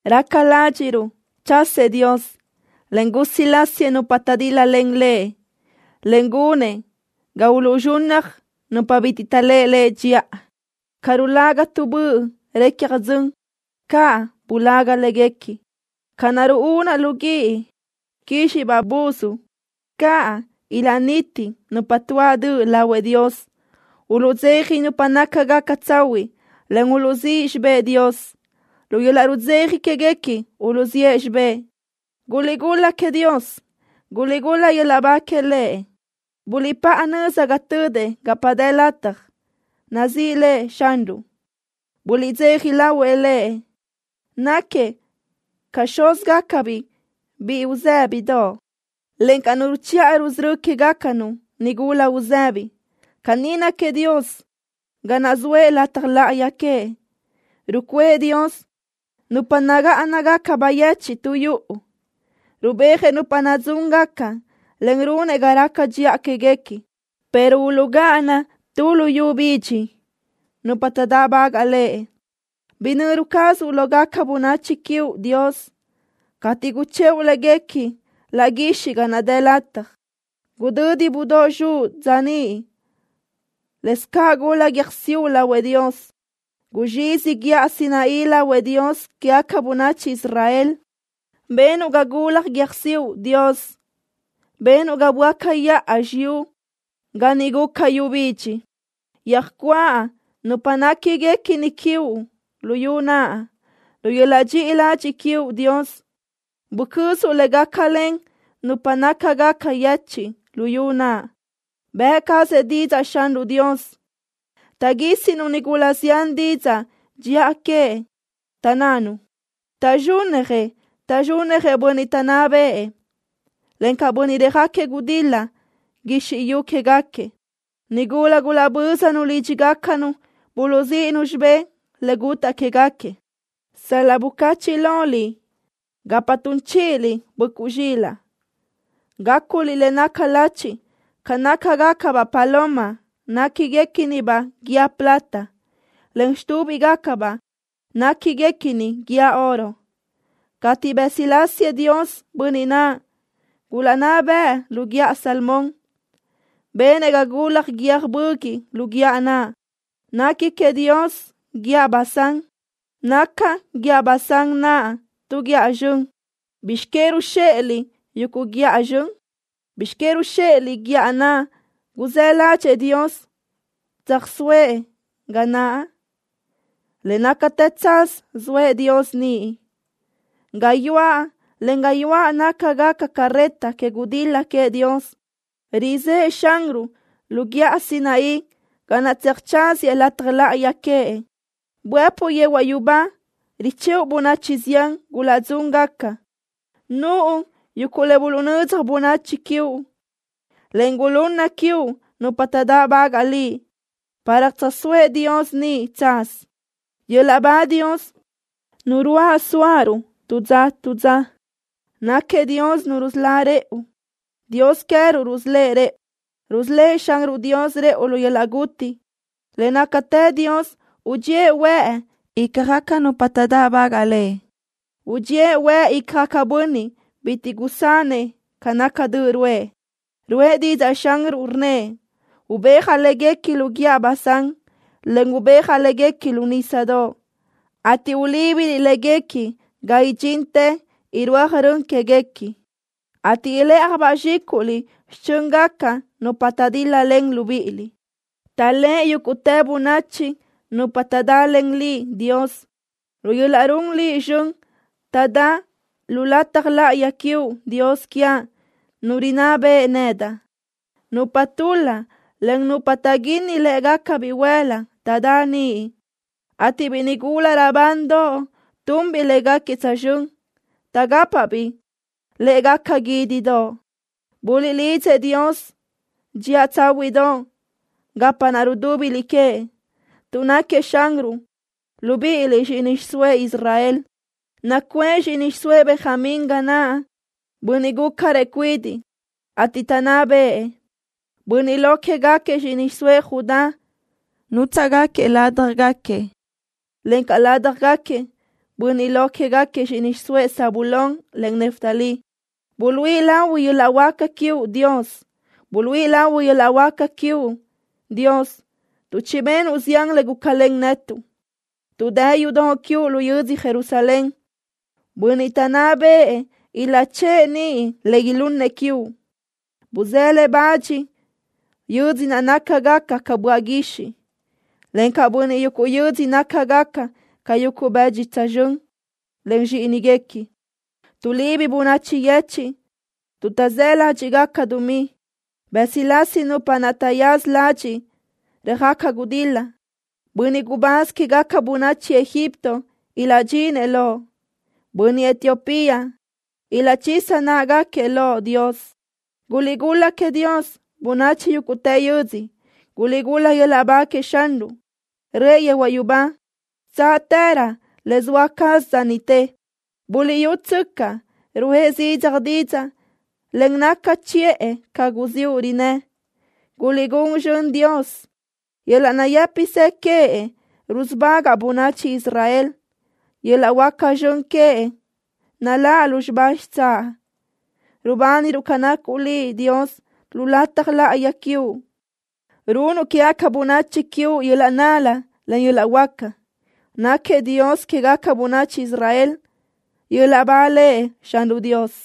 Raca ládxiʼruʼ chasëʼ Dios, en usulásiëʼ nupa taʼdíl-lalen Lëʼ, en gunëʼ ga uluʼzxunnaj nupa bitiʼ taʼléʼe Lëʼ dxiʼa. Ca rulaga tu böʼ recja dzön, caʼ bulaga léguequi. Ca naʼ ruúnaʼ lu guíʼ quízxiʼbaʼ buz, caʼ ilaʼniti nupa tuáʼ döʼ lahuëʼ Dios. Uluʼdzeja nupa nácagaca tsahuiʼ, en uluʼzíʼ xibë́ʼ Dios. Lu yöl-laʼ rudzeja quéguequi uluʼzíʼ xibë́ʼ. ¡Guliʼgul-la queëʼ Dios! ¡Guliʼgul-la yöl-laʼ ba que Lëʼ! Buliʼpáʼa nöza ga tödëʼ gapa dë lataj. ¡Nazíʼi lëʼ Xanruʼ! ¡Buliʼdzeja lahuëʼ Lëʼ! Náquiëʼ ca xúzgacabiʼ biʼi uzë́bidoʼ, encaʼ Nu ruchiʼa rusörö́ quégacanu nigula uzëbi. Caní náquiëʼ Dios ga naʼ zoëʼ lataj láʼayi queëʼ. Rucuʼë Dios nupa nagáʼanagaca bayechiʼ tu yuʼu. Rubéajëʼ nupa nadzúngaca, en runëʼ ga raca dxiʼa quéguequi, pero uluʼgáʼana tu luyú bidxi nupa taʼdáʼbagaʼ Lëʼ. Yöjnöru cazuʼ lógaca bönachi quiuʼ, Dios, cateʼ guchëʼu léguequi laʼ guixiʼ ga naʼ dë lataj. Gudödi budóʼ zxuʼ dza niʼ. Lëscaʼ gula guiö́jsiuʼ lahuëʼ Dios. Guzxizi guíʼa Sinaí lahuëʼ Dios quégaca bönachi Israel. Benuʼ ga gulaj guiö́jsiuʼ, Dios. Benuʼ ga böáca yaʼa xiyúʼ ga niʼ guca yu bidxi. Yöjcuáʼ nupa néquiguequi quiuʼ luyú naʼ. Lu yöl-laʼ dxiʼi ladxiʼ quiuʼ, Dios, bucözuʼ le gácalen nupa nácagaca yechiʼ luyú naʼ. Bëʼ cazëʼ didzaʼ Xanruʼ Dios. Taʼguísinu nigula zián didzaʼ dxiʼa queëʼ, taʼnnanu: “¡Taʼzxúnnajëʼ! ¡Taʼzxúnnajëʼ bönniʼ taʼnná bëʼë, encaʼ bönniʼ röjáquiëʼ gudil-la guizxi yu quégaquiëʼ!” Nigula gulaʼbö́zanu lídxigacanu buluʼzíʼinu xibé le gutáʼ quégaquiëʼ. Sal-laʼ bucachiʼ loliʼ gapa tun chíʼiliʼ böʼcuʼ zxilaʼ, gáculiʼ le naca lachi ca nácagacabaʼ guʼdödoʼ néquiguequinibaʼ guíë plata, en xitúbigacabaʼ néquiguequini guíë oro. Cateʼ bësilásiëʼ Dios bönniʼ naʼ gulaʼnná bëʼë lu guíʼa Salmón, benëʼ ga gula guiö́j böguiʼ lu guíʼa naʼ. Nequi queëʼ Dios guíʼa Basán. Naca guíʼa Basán naʼ tu guíʼa zxön. ¿Bizx que ruzxéʼeliʼ, yuguʼ guíʼa zxön? ¿Bizx que ruzxéʼeliʼ guíʼa naʼ guzë́ ládxëʼë Dios tsöjsóëʼ ga naʼ? Le nácatë tsaz soëʼ Dios niʼ. Gayuáʼ, en gayuáʼ nácagaca carreta que gudil-la queëʼ Dios. Rizë́ʼë Xanruʼ lu guíʼa Sinaí ga naʼ tseajtsaziëʼ lataj láʼayi queëʼ. Buëpuʼ yehuaʼ yubá richëʼu bönachi zián gulaʼdzúngaca. Nuʼu yuguʼ le buluʼnödzaj bönachi quiuʼ, en le gulunna quiuʼ nupa taʼdáʼbagaʼ Liʼ, para tsöjsóëʼ Dios niʼ tsaz. ¡Yöl-laʼ ba Dios, Nu ruáʼ suaʼruʼ tu dza tu dza! ¡Náquiëʼ Dios Nu rusölá rëʼu! ¡Dios queë́ruʼ rusölë́ʼ rëʼu! ¡Rusölë́ʼ Xanruʼ Dios rëʼu lu yöl-laʼ guti! Le nácatë Dios udxíëʼ huëʼ ícjagaca nupa taʼdáʼbagaʼ Lëʼ. Udxíëʼ huëʼ icjëʼ bönniʼ bitiʼ gusanëʼ ca naca döʼ ruʼë. Ruʼë didzaʼ Xanruʼ, rnnëʼ: “Ubéajaʼ léguequi lu guíʼa Basán, en ubéajaʼ léguequi lu nísadoʼ, ateʼ ulíbiliʼ léguequi ga idxintë irúaj rön quéguequi, ateʼ ilë́ʼajbaʼ zxículiʼ xichö́ngaca nupa taʼdil-lalen libíʼiliʼ.” Taʼléʼe yúguʼtë bönachi nupa taʼdalen Liʼ, Dios. Lu yöl-laʼ run Liʼ zxön taʼdá lu lataj láʼayi quiuʼ, Dios quiaʼ, Nu rinná beʼe nedaʼ. Nupa tul-la, en nupa taʼguínnaj lë́ʼegaca bihuël-la, taʼdá niʼ, ateʼ biʼi nigula raʼbandoʼ tunbiʼ léguequi tsözxö́n, taʼgápabiʼ lë́ʼegaca guídidoʼ. Buliʼlidzëʼ Dios dxiʼa tsáhuiʼdoʼ gapa naʼ rudúbiliʼ queëʼ, tuʼ náquiëʼ Xanruʼ, libíʼiliʼ zxíʼini xiʼsóëʼ Israel. Nacuʼë zxíʼini xiʼsóëʼ Benjamín ga naʼ, bönniʼ gúcarëʼ cuidiʼ, ateʼ taʼnná bëʼë. Bönniʼ lo quégaquiëʼ zxíʼini xiʼsóëʼ Judá nútsaʼgaquiëʼ ládjagaquiëʼ, encaʼ ládjagaquiëʼ bönniʼ lo quégaquiëʼ zxíʼini xiʼsóëʼ Zabulón, en Neftalí. Buluíʼi lahui yöl-laʼ huáca quiuʼ, Dios. Buluíʼi lahui yöl-laʼ huáca quiuʼ, Dios, tuʼ chibenuʼ zián le gulácalen netuʼ. Tuʼ dë yudoʼ quiuʼ lu yödzö Jerusalén, bönniʼ taʼnná bëʼë ilaʼchë́ʼë niʼ le ilunnëʼ quiuʼ. Buzé le bach bönachi yödzö naʼ nácagaca ca böaʼ guixiʼ, encaʼ bönachi yuguʼ yödzö nácagaca ca yuguʼ bëdxi tsözxö́n len zxíʼiniguequi. Tuʼlibi bönachi yechiʼ tuʼ taʼzë́ ládxiʼgaca dumí. Bësilási nupa naʼ taʼyaza ladxiʼ röjaca gudil-la. Bönniʼ gubáz quégaca bönachi Egipto ilaʼdxinëʼ loʼ. Bönniʼ Etiopía ilaʼchisa náʼagaquiëʼ loʼ, Dios. ¡Guliʼgul-la queëʼ Dios, bönachi yúguʼtë yödzö! ¡Guliʼgul-la yöl-laʼ ba queëʼ Xanruʼ! Röʼë yehuaʼ yubá xitsáʼtërö, le zoa caz dza niʼte. Buliʼyútsöcaʼ, ruʼë zidzaj didzaʼ, en naca chiʼë ca guziúʼ rinnë́. ¡Guliʼgún zxönëʼ Dios! Yöl-laʼ nayë́pisë queëʼ rusubagaʼ bönachi Israel. Yöl-laʼ huáca zxön queëʼ naláʼ lúzxiba xitsáʼ. Rubániruʼ ca nacuʼ Liʼ, Dios, lu lataj láʼayi quiuʼ. Runnuʼ quégaca bönachi quiuʼ yöl-laʼ nal-la, en yöl-laʼ huáca. Náquiëʼ Dios quégaca bönachi Israel. ¡Yöl-laʼ ba Lëʼ Xanruʼ Dios!